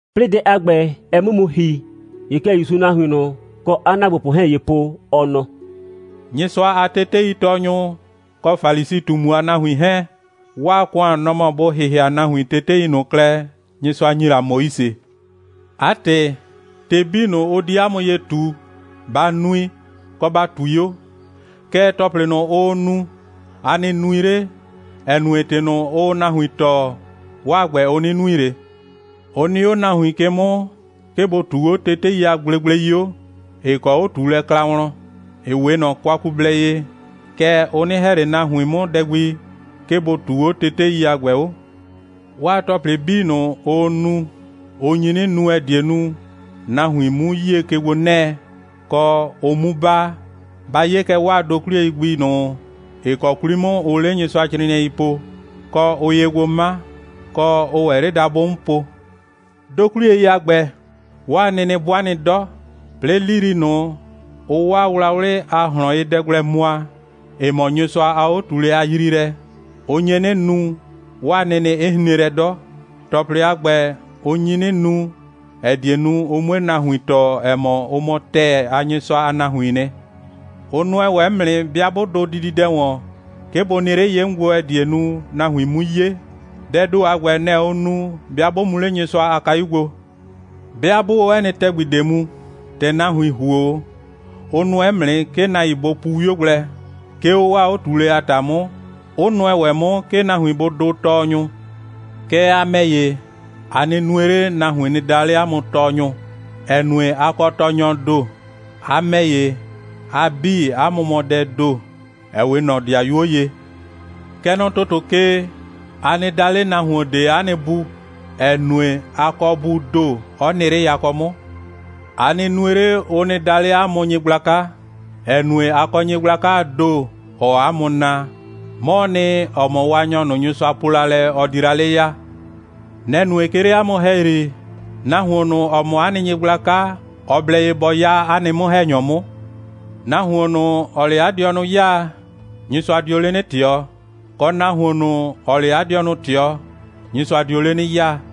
'Plɩɩ dɛ a ‑gbɛ, ɛ 'mʋ mu ‑hi, ‑ye kɛ ‑Yusuu nahuin ꞊nʋ, kɔ 'a ‑naagbopʋ 'hɛɛn ye po, ɔ nɔ: «Nyɩsʋa a teteitɔɔnyʋ kɔ Falisi꞊tumu a nahuin 'hɛɛn, 'waa ‑kʋan, nɔ‑ mɔ bʋ ‑hɩhɩa nahuin tetei ꞊nʋ klɛ, Nyɩsʋa ‑nyi la Moise. 'A ‑tɩ, ‑tɩ 'bii ꞊nʋ, ʋ di 'a mʋ ye ꞊tu, ba nui, kɔ, ba ꞊tui 'o. Kɛɛ, ‑tɔplɩ ꞊nʋ, ʋʋ nu, a nɩ nui 'le, ‑ɛ nue, ‑tɩ ꞊nʋ, ʋʋ nahuin tɔɔ, 'waa ‑gbɛ, ʋ 'nɩ nui ꞊le. Ʋ nɩ 'o nahuin ke 'mʋ, 'ke bʋ ꞊tuu 'o tetei a gblegblei 'o, ‑ɩ kɔ 'o꞊tuulɛ kla wlɔn, ‑ɩ 'we ꞊nɔ kwakublɛ ye, kɛɛ, ʋ 'nɩ ‑hɛ ꞊le nahuin 'mʋ dɛ gbi, 'ke bʋ ꞊tuu 'o tetei a ‑gbɛ 'o. 'Waa ‑tɔplɩ 'bii, ʋʋ nu, ʋ nyi 'nɩ nu, ‑ɛ die nu, nahuin 'mu 'yie ke gbo 'nɛɛ, kɔ, ʋ 'mu baa. Ba 'ye kɛ 'waa dokwliyei gbi ꞊nʋ, ‑ɩ kɔ 'kwli 'mʋ ʋʋ 'le Nyɩsʋacrɩɩnɩɛi po, kɔ, ʋʋ ye gbo 'ma, kɔ, ʋʋ ‑wɛ 'le dabʋ 'mʋ po. Dokwliyei a ‑gbɛ, 'waa nɩnɩ 'bʋa nɩ 'dɔ. 'Plɩɩ, 'lili ꞊nʋ, ʋʋ 'waa wlawlɩ a ꞊hlɔnyedɛ gblɛ mʋa, ‑ɩ mɔ Nyɩsʋa a 'o꞊tuulɛ a yriilɛ, ʋ nye 'nɩ nu, 'waa nɩnɩ 'ɩ hren lɛ 'dɔ. ‑Tɔplɩ a ‑gbɛ, ʋ nyi 'nɩ nu, ‑ɛ die nu, ʋ 'mue nahuin tɔɔ, ‑ɛ mɔ, ʋ mɔ ‑tɛɛ a Nyɩsʋa a nahuiin nɩ. Ʋ nʋɛ ‑wɛ 'mʋ nɩ, 'bɩa 'bʋ dʋ dididɛ ‑wɔn, 'ke bʋ nɩ 'le ye 'mʋ gbo, ‑ɛ die nu, nahuin 'mu 'ye. Dɛɛ ‑do a ‑gbɛ, nɛ‑ ʋʋ nu, 'bɩa 'bʋ mu 'le Nyɩsʋa a kayu gbo. 'Bɩa 'bʋʋ 'o 'ɛ nɩ ‑tɛgbi ꞊de mu, ‑tɛ nahuin ‑huo 'o, ʋ nʋɛ 'mʋ nɩ, 'ke nahuin bʋ pu 'wio gblɛ, 'ke 'o 'waa 'o꞊tuulɛ a ‑ta 'mʋ, 'ʋ nʋɛ ‑wɛ 'mʋ, 'ke nahuin bʋ dʋʋ Tɔɔnyʋ. Kɛɛ, a ‑mɛ ‑ye, a nɩ nue 'le, nahuin nɩ daa 'le 'a mʋ Tɔɔnyʋ, ‑ɛ nue, a kɔ Tɔɔnyɔɔ ‑do. A ‑mɛ ‑ye, a 'bii, 'a mʋ mɔ dɛɛ ‑do, ‑ɛ 'we ꞊nɔ 'dɩayuo ye. Kɛ nɔ ‑tʋtʋ ke, a nɩ daa 'le nahuon ꞊de 'a nɩ Bu, ‑ɛ nue, a kɔ Buu ‑do, 'ɔ nɩ 'le yakɔ 'mʋ. A nɩ nue 'le, ʋ nɩ daa 'le 'a mʋ Nyɩgblaka, ‑ɛ nue, a kɔ Nyɩgblakaa ‑do, ‑ɔɔ 'a mʋ naa. 'Mɔɔ nɩ, ‑ɔ mɔ Waanyɔ ꞊nʋ, Nyɩsʋa po la lɛ, ɔ di la 'le ya. Nɛ‑ nue, 'ke 'le 'a mʋ ‑hɛyri, nahuon ꞊nʋ, ‑ɔ mɔ 'a nɩ nyɩgblaka, ɔ blɛ ye bɔ 'ya 'a nɩ 'mʋ‑hɛnyɔ 'mʋ. Nahuon ꞊nʋ, ‑ɔɔ 'le 'a dɩɔnʋ 'yaa, Nyɩsʋa dio 'le 'nɩ ꞊tɩɔ, kɔ, nahuon ꞊nʋ, ‑ɔɔ 'le 'a dɩɔnʋ ꞊tɩɔ, Nyɩsʋa dio 'le 'nɩ 'yaa.»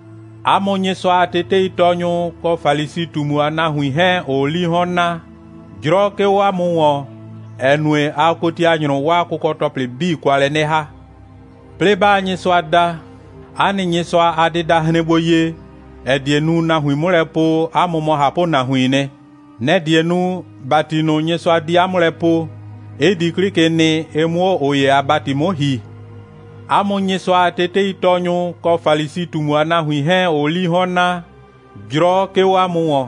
'A mʋ Nyɩsʋa a teteitɔɔnyʋ kɔ Falisi꞊tumu a nahuin 'hɛɛn, ‑ʋʋ 'lii 'hɔn naa, 'jrɔ 'ke 'o 'a mʋ ‑wɔn, ‑ɛ nue, aa kotianyrʋ 'waa kʋkɔ‑tɔplɩ 'bii kwa lɛ 'nɩ ‑ha. 'Plɩɩ 'baa Nyɩsʋa da, 'a nɩ Nyɩsʋa a dɩda hren gbo ye, ‑ɛ die nu, nahuin 'mʋ lɛ po, 'a mʋ mɔ ꞊hapʋnahuiin nɩ. Nɛ‑ die nu, ‑bati ꞊nʋ, Nyɩsʋa di 'a mʋ lɛ poo, 'ɩ di 'klɩ ke nɩ, ɩ 'mʋ 'o ꞊ʋ ‑ye a ‑bati 'mʋ ‑hi.] 'A mʋ Nyɩsʋa a teteitɔɔnyʋ kɔ Falisi꞊tumu a nahuin 'hɛɛn, ‑ʋʋ 'lii 'hɔn naa, 'jrɔ 'ke 'o 'a mʋ ‑wɔn.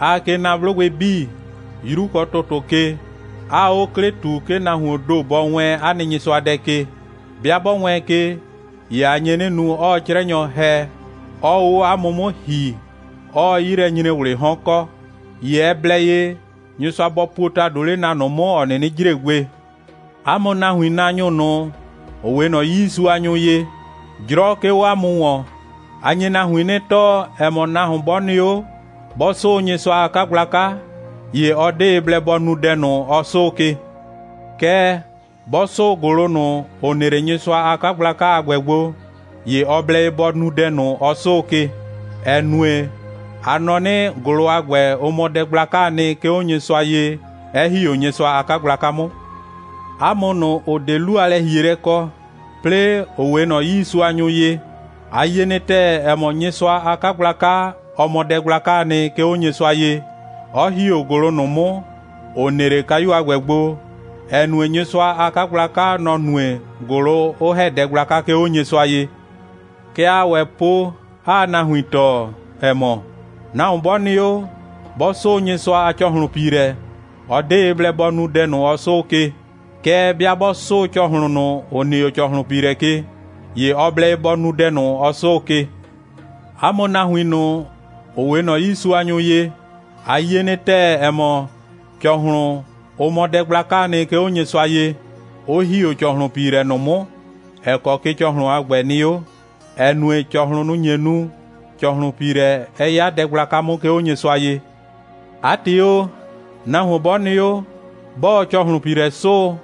Aa ke na 'blʋgbɩ 'bii, 'yru kɔ ‑tʋtʋ ke, 'aa 'o 'klɩ ꞊tu, 'ke nahuoon ‑do bɔ wɛɛn 'a nɩ Nyɩsʋadɛ ke. 'Bɩa 'bɔ wɛɛn ke, ‑ye a nye 'nɩ nu, 'ɔɔ 'crɛnyɔ ‑hɛ, 'ɔɔ 'o 'a mʋ 'mʋ ‑hi, 'ɔɔ 'yilɛnyre꞊wlɩɩ 'hɔn kɔ. ‑Ye ɛ blɛ ye, Nyɩsʋa bɔ puo ‑tado 'le na ꞊nʋ 'mʋ, ‑ɔ 'nɩnɩ jre gbe. 'A mʋ nahuinnaanyʋ ꞊nʋ, ‑ʋ 'we ꞊nɔ 'yiisuanyʋ ye, 'jrɔ 'ke 'o 'a mʋ ‑wɔn. A nye nahuin 'nɩ tɔɔ, ‑ɛ mɔ, nahuon 'bɔ nɩ 'o, 'bɔ 'sʋʋ Nyɩsʋa a 'kagblaka, ‑ye ɔ 'de ye blɛ bɔ nu dɛ ꞊nʋ, ɔ 'sʋʋ ke. Kɛɛ, 'bɔ 'sʋʋ ‑gʋlʋ ꞊nʋ, ‑ʋ nɩ 'le Nyɩsʋa a 'kagblaka a ‑gbɛ gbo, ‑ye ɔ blɛ ye bɔ nu dɛ ꞊nʋ, ɔ 'sʋʋ ke, (‑ɛ nue, a nɔ 'nɩ, ‑gʋlʋ a ‑gbɛ, ʋ mɔ dɛ gblakaa nɩ, 'ke 'o Nyɩsʋa ye, 'ɛ ‑hi 'o Nyɩsʋa a 'kagblaka 'mʋ.) 'A mʋ ꞊nʋ, ‑ʋ 'de 'lu a lɛ‑hielɛ kɔ, 'plɩɩ, ‑ʋ 'we ꞊nɔ 'yiisuanyʋ ye, a yie nɩ ‑tɛɛ, ‑ɛ mɔ, Nyɩsʋa a 'kagblaka, ɔ mɔ dɛ gblakaa nɩ, 'ke 'o Nyɩsʋa ye, 'ɔ ‑hi 'o ‑gʋlʋ ꞊nʋ 'mʋ, ‑ʋ nɩ 'le kayu a ‑gbɛ gbo, ‑ɛ nue, Nyɩsʋa a 'kagblaka, nɔ‑ nue, ‑gʋlʋ 'ʋ ‑hɛ dɛ gblaka, 'ke 'o Nyɩsʋa ye. Kɛ aa ‑wɛ po, 'aa nahuin tɔɔ, ‑ɛ mɔ, nahuon 'bɔ nɩ 'o, 'bɔ 'sʋʋ Nyɩsʋa a ‑cɔhlʋnpiilɛ, ɔ 'de ye blɛ bɔ nu dɛ ꞊nʋ, ɔ 'sʋʋ ke. Kɛɛ, 'bɩa 'bɔ 'sʋʋ ‑cɔhlʋn ꞊nʋ, ‑ʋ nɩ 'o ‑cɔhlʋnpiilɛ ke, ‑ye ɔ blɛ ye bɔ nu dɛ ꞊nʋ, ɔ 'sʋʋ ke. 'A mʋ nahuin ꞊nʋ, ‑ʋ 'we ꞊nɔ 'yiisuanyʋ ye, a yie nɩ ‑tɛɛ, ‑ɛ mɔ, ‑cɔhlʋn, ʋ mɔ dɛ gblakaa nɩ, 'ke 'o Nyɩsʋa ye, 'ʋ ‑hi 'o ‑cɔhlʋnpiilɛ ꞊nʋ 'mʋ, ‑ɛ kɔ ke ‑cɔhlʋn a ‑gbɛ nɩ 'o, ‑ɛ nue, ‑cɔhlʋn, nʋ‑ nye nu, ‑cɔhlʋnpiilɛ 'ɛ 'ya dɛ gblaka 'mʋ, 'ke 'o Nyɩsʋa ye. 'A ‑tɩ o, nahuon 'bɔ nɩ 'o, 'bɔɔ ‑cɔhlʋnpiilɛ 'sʋʋ,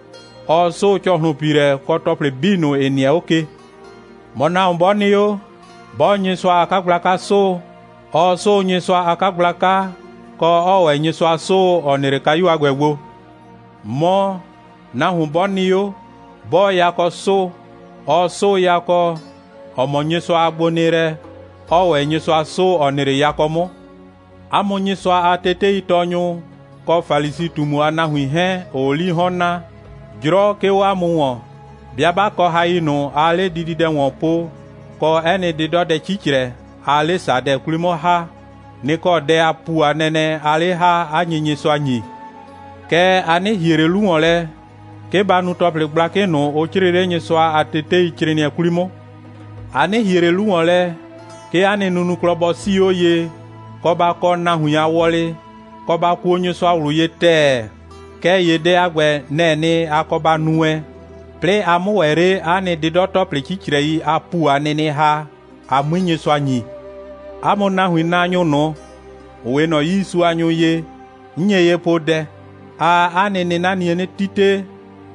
ɔɔ 'sʋʋ ‑cɔhlʋnpiilɛ, kɔ ‑tɔplɩ 'bii ꞊nʋ, ‑ɩ nɩɛ 'o ke. Mɔ, nahuon 'bɔ nɩ 'o, 'bɔɔ Nyɩsʋa a 'kagblaka 'sʋʋ, ɔɔ 'sʋʋ Nyɩsʋa a 'kagblaka, kɔ, 'ɔɔ ‑wɛ Nyɩsʋa 'sʋʋ, ‑ɔ nɩ 'le kayu a ‑gbɛ gbo. Mɔ, nahuon 'bɔ nɩ 'o, 'bɔɔ yakɔ 'sʋʋ, ɔɔ 'sʋʋ yakɔ, ‑ɔ mɔ Nyɩsʋa a gbonɩɩlɛ, 'ɔɔ ‑wɛ Nyɩsʋa 'sʋʋ, ‑ɔ nɩ 'le yakɔ 'mʋ. 'A mʋ Nyɩsʋa a teteitɔɔnyʋ kɔ Falisi꞊tumu a nahuin 'hɛɛn, ‑ʋʋ 'lii 'hɔn naa, 'jrɔ 'ke 'o 'a mʋ ‑wɔn. 'Bɩa 'ba kɔ hai ꞊nʋ, aa 'le dididɛ ‑wɔn po, kɔ 'ɛ nɩ 'dɩdɔdɛ 'cicrɛ, aa 'le ‑sadɛ 'kwli 'mʋ ‑ha, nɩ‑ kɔ dɛ a ‑pu a nɛnɛ aa 'le ‑ha, 'a nye Nyɩsʋa ‑nyi. Kɛɛ, a 'nɩ ‑hie ꞊le 'lu ‑wɔn lɛ, 'ke ba nu ‑tɔplɩ gblakɩ ꞊nʋ, ʋ 'crɩɩ 'le Nyɩsʋa a teteicrɩɩnɩɛ 'kwli 'mʋ. A 'nɩ ‑hie ꞊le 'lu ‑wɔn lɛ, 'ke 'a nɩ nunuklɔ bɔ 'sii 'o ye, kɔ, ba kɔ nahuin a wɔlɩ, kɔ, ba kuo Nyɩsʋa ꞊wlʋ ye ‑tɛɛ. Kɛɛ ‑ye dɛ a ‑gbɛ, nɛ‑ɛ nɩ, a kɔ ba nu wɛn, 'plɩɩ a 'mʋ ‑wɛ 'le 'a nɩ 'dɩdɔ‑tɔplɩ 'cicrɛi a ‑pu a nɩnɩ ‑ha, a 'mui Nyɩsʋa ‑nyi. 'A mʋ nahuinnaanyʋ ꞊nʋ, ‑ʋ 'we ꞊nɔ 'yiisuanyʋ ye, 'n nye ye poo dɛ: Aa 'a nɩ 'nɩnanie 'nɩ 'tite,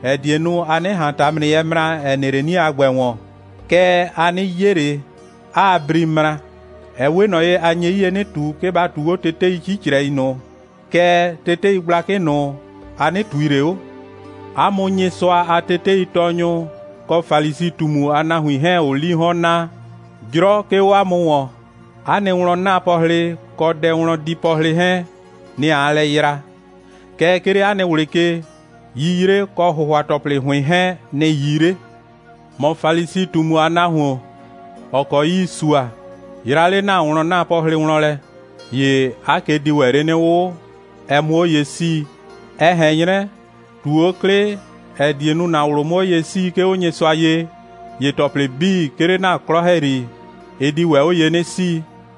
‑ɛ die nu, a 'nɩ ꞊han ‑tamrɩyɛɛ ꞊de mra, ‑ɛ nɩ 'le 'nie a ‑gbɛ ‑wɔn, kɛɛ, a 'nɩ 'ye ꞊le, 'aa bri mra. (Ɛ 'we ꞊nɔ ye, a nye 'yie 'nɩ ꞊tu, 'ke ba ꞊tuu 'o tetei 'cicrɛi ꞊nʋ, kɛɛ, tetei gblakɩ ꞊nʋ, a 'nɩ ꞊tui ꞊le 'o.) 'A mʋ Nyɩsʋa a teteitɔɔnyʋ kɔ Falisi꞊tumu a nahuin 'hɛɛn, ‑ʋʋ 'lii 'hɔn naa, 'jrɔ 'ke 'o 'a mʋ ‑wɔn. 'A nɩ wlɔn'naapɔhlɩ kɔ dɛwlɔndiipɔhlɩ 'hɛɛn, nɩ‑ aa lɛ yra. Kɛɛ, 'ke 'le 'a nɩ ꞊wlɩ ke, 'yiyre kɔ ‑hʋhʋa‑tɔplɩ ‑hʋɩn 'hɛɛn, nɩ‑ 'yii 'le. ‑Mɔ Falisi꞊tumu a nahuon, ‑ɔ kɔ 'yii sua, yra 'le ‑na wlɔn'naapɔhlɩ wlɔn lɛ, ‑ye 'a ke di ‑wɛ 'le 'nɩ 'wʋ, ɛ 'mʋ 'o ye 'sii. (Ɛ ꞊hɛn 'nyrɛ, ꞊tu 'o 'klɩ, ‑ɛ die nu, ‑na ꞊wlʋ 'mʋ 'o ye 'sii, 'ke 'o Nyɩsʋa ye, ‑ye ‑tɔplɩ 'bii, 'ke 'le ‑na 'klɔ ‑hɛyri, ɩ di ‑wɛ 'o ye 'nɩ 'sii.)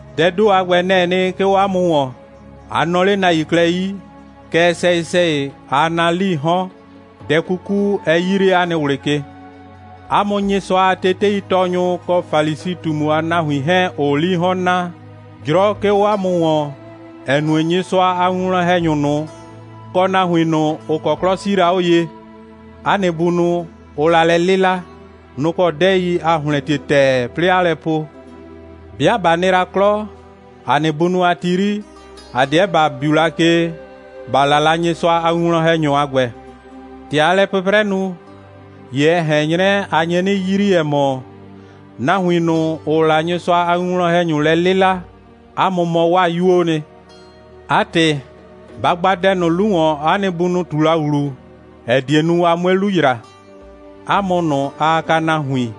Dɛɛ ‑do a ‑gbɛ, nɛ‑ɛ nɩ, 'ke 'o 'a mʋ ‑wɔn. A nɔɔ 'le nahuin klɛ 'yi, kɛɛ, sɛyɩ‑sɛyɩ, aa naa 'lii 'hɔn, dɛ 'kuku 'ɛ 'yii 'le 'a nɩ ꞊wlɩ ke.» «'A mʋ Nyɩsʋa a teteitɔɔnyʋ kɔ Falisi꞊tumu a nahuin 'hɛɛn, ‑ʋʋ 'lii 'hɔn naa, 'jrɔ 'ke 'o 'a mʋ ‑wɔn, ‑ɛ nue, Nyɩsʋa a winwlɔn‑hɛnyʋ ꞊nʋ, kɔ nahuin ꞊nʋ, ‑ʋ kɔ 'klɔ 'sii la 'o ye, 'a nɩ bunʋ, ʋʋ la lɛ 'lɩla, nʋ‑ kɔ 'dɛɛi aa ‑hlɛntie ‑tɛɛ, 'plɩɩ 'aa lɛ po: 'Bɩa ꞊ba nɩ la 'klɔ, ‑a nɩ bunʋ a ti 'yri, ‑a 'deɛ ‑ba biu la ke, ‑ba 'la la Nyɩsʋa a winwlɔn‑hɛnyʋ a ‑gbɛ. ‑Tɛ aa lɛ 'pʋprɛ nu, ‑ye ɛ ꞊hɛn 'nyrɛ, a nye 'nɩ yrii, ‑ɛ mɔ, nahuin ꞊nʋ, ‑ʋʋ la Nyɩsʋa a winwlɔn‑hɛnyʋ lɛ 'lɩla, 'a mʋ mɔ 'waa 'yuoo nɩ. 'A ‑tɩ, ba gba dɛ ꞊nʋ 'lu ‑wɔn, 'a nɩ bunʋ ꞊tu la ‑wlu, ‑ɛ die nu, a 'mue 'lu ‑yra. 'A mʋ ꞊nʋ, aa kaa nahuin,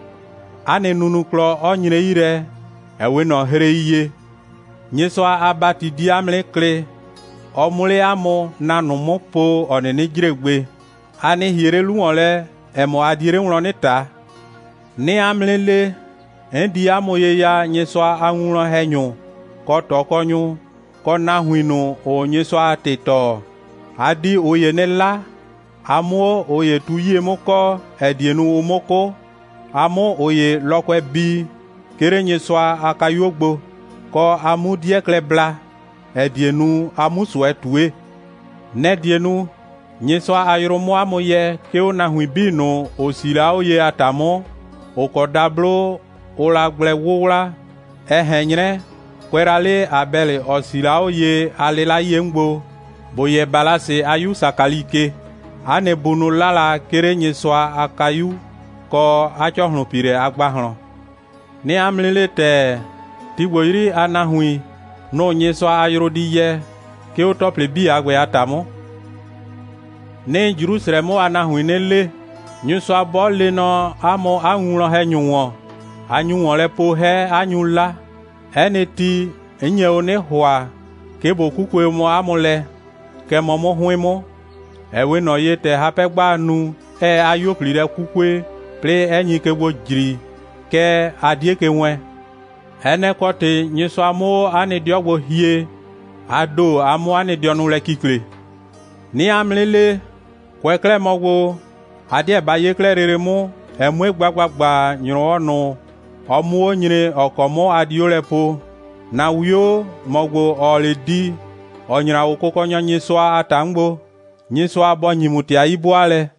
'a nɩ nunuklɔ 'ɔ nyre 'yi lɛ, ‑ɛ 'we ꞊nɔ hrei ye. Nyɩsʋa a ‑bati di 'a mʋ 'nɩ klɩ, ɔ 'mʋ 'le 'a mʋ na ꞊nʋ 'mʋ po, ‑ɔ 'nɩnɩ jre gbe. A nɩ ‑hie 'le 'lu ‑wɔn lɛ, ‑ɛ mɔ, a die 'le wlɔn 'nɩ ꞊ta. 'Nɩɩ 'a mʋ 'nɩ le, 'n di 'a mʋ ye ya Nyɩsʋa a winwlɔn‑hɛnyʋ, kɔ ꞊tɔkɔnyʋ, kɔ nahuin ꞊nʋ, ‑ʋʋ Nyɩsʋa a ‑tɩ tɔɔ. A di ꞊ʋ ‑ye 'nɩ 'la, a 'mʋ 'o ꞊ʋ ‑ye tu 'yie 'mʋ kɔɔ, ‑ɛ die nu, ʋ 'mʋ 'kʋ, a 'mʋ ꞊ʋ ‑ye lɔkʋɛ bii, 'ke 'le Nyɩsʋa a kayuo gbo, kɔ, a 'mu 'dɩɛ klɛ bla, ‑ɛ die nu, a 'mu ꞊sʋɛ ꞊tue. Nɛ‑ die nu, Nyɩsʋa a yrʋ 'mʋ 'a mʋ yɛ, 'ke 'o nahuin 'bii ꞊nʋ, ‑ʋ 'sii la 'o ye a ‑ta 'mʋ, ‑ʋ kɔ dablo ʋʋ la gblɛ 'wʋwla, ɛ ꞊hɛn 'nyrɛ, kʋɛ la 'le Abɛlɩ, ‑ɔ 'sii la 'o ye a 'lɩla 'yie 'mʋ gbo, ‑bo yɛ Balasi a 'yu Sakali ke, 'a nɩ bunʋ 'la la, 'ke 'le Nyɩsʋa a kayu kɔ 'a ‑cɔhlʋnpiilɛ a ‑gbahlɔn. 'Nɩɩ 'a mʋ 'nɩ le ‑tɛɛ, ti ‑gbo 'yri a nahuin, nʋ‑ Nyɩsʋa a yrʋ di yɛ, 'ke 'o ‑tɔplɩ 'bii a ‑gbɛ a ‑ta 'mʋ.» «'Nɩɩ Jrusrɛ 'mʋ a nahuin 'nɩ le: Nyɩsʋa 'bɔ lee nɔ 'a mʋ 'a winwlɔn‑hɛnyʋ ‑wɔn, a nyu ‑wɔn lɛ po 'hɛ, 'a nyu 'la. 'Ɛ nɩ ti, 'n nye o 'nɩ ‑hʋa, 'ke ꞊bo 'kukue o mɔ 'a mʋ lɛ, kɛ mɔ 'mʋ 'hʋɩn 'mʋ, ‑ɛ 'we ꞊nɔ ye, ‑tɛ hapɛ'gbaa nu, 'ɛɛ 'a 'yuo꞊pli lɛ 'kukue, 'plɩɩ 'ɛ nyi ke gbo ꞊jri, kɛɛ, a 'die ke wɛɛn. Ɛ nɛ‑ kɔ ‑tɩ Nyɩsʋa 'mʋ 'o 'a nɩ 'dɩɔ gbo hie, a ‑do, a 'mʋ 'a nɩ dɩɔnʋ lɛ kikle. 'Nɩɩ 'a mʋ 'nɩ le, kʋɛ 'klɛɛ mɔ gbo, a 'deɛ ba 'ye 'klɛɛ lele 'mʋ, ɛ 'mue gba ‑gbagba, ‑nyrɔwɔ ꞊nʋ, ɔ 'mʋ 'o nyre, ‑ɔ kɔ 'mʋ a di 'o lɛ poo: ‑Na 'wio, ‑mɔ ‑gbo, ‑ɔɔ 'le di, ‑ɔ nyra 'o Kʋkɔnyɔ Nyɩsʋa a ‑ta 'mʋ gbo. Nyɩsʋa bɔ ‑nyi ‑mʋ ‑tɩ a 'yi'bʋaalɛ!»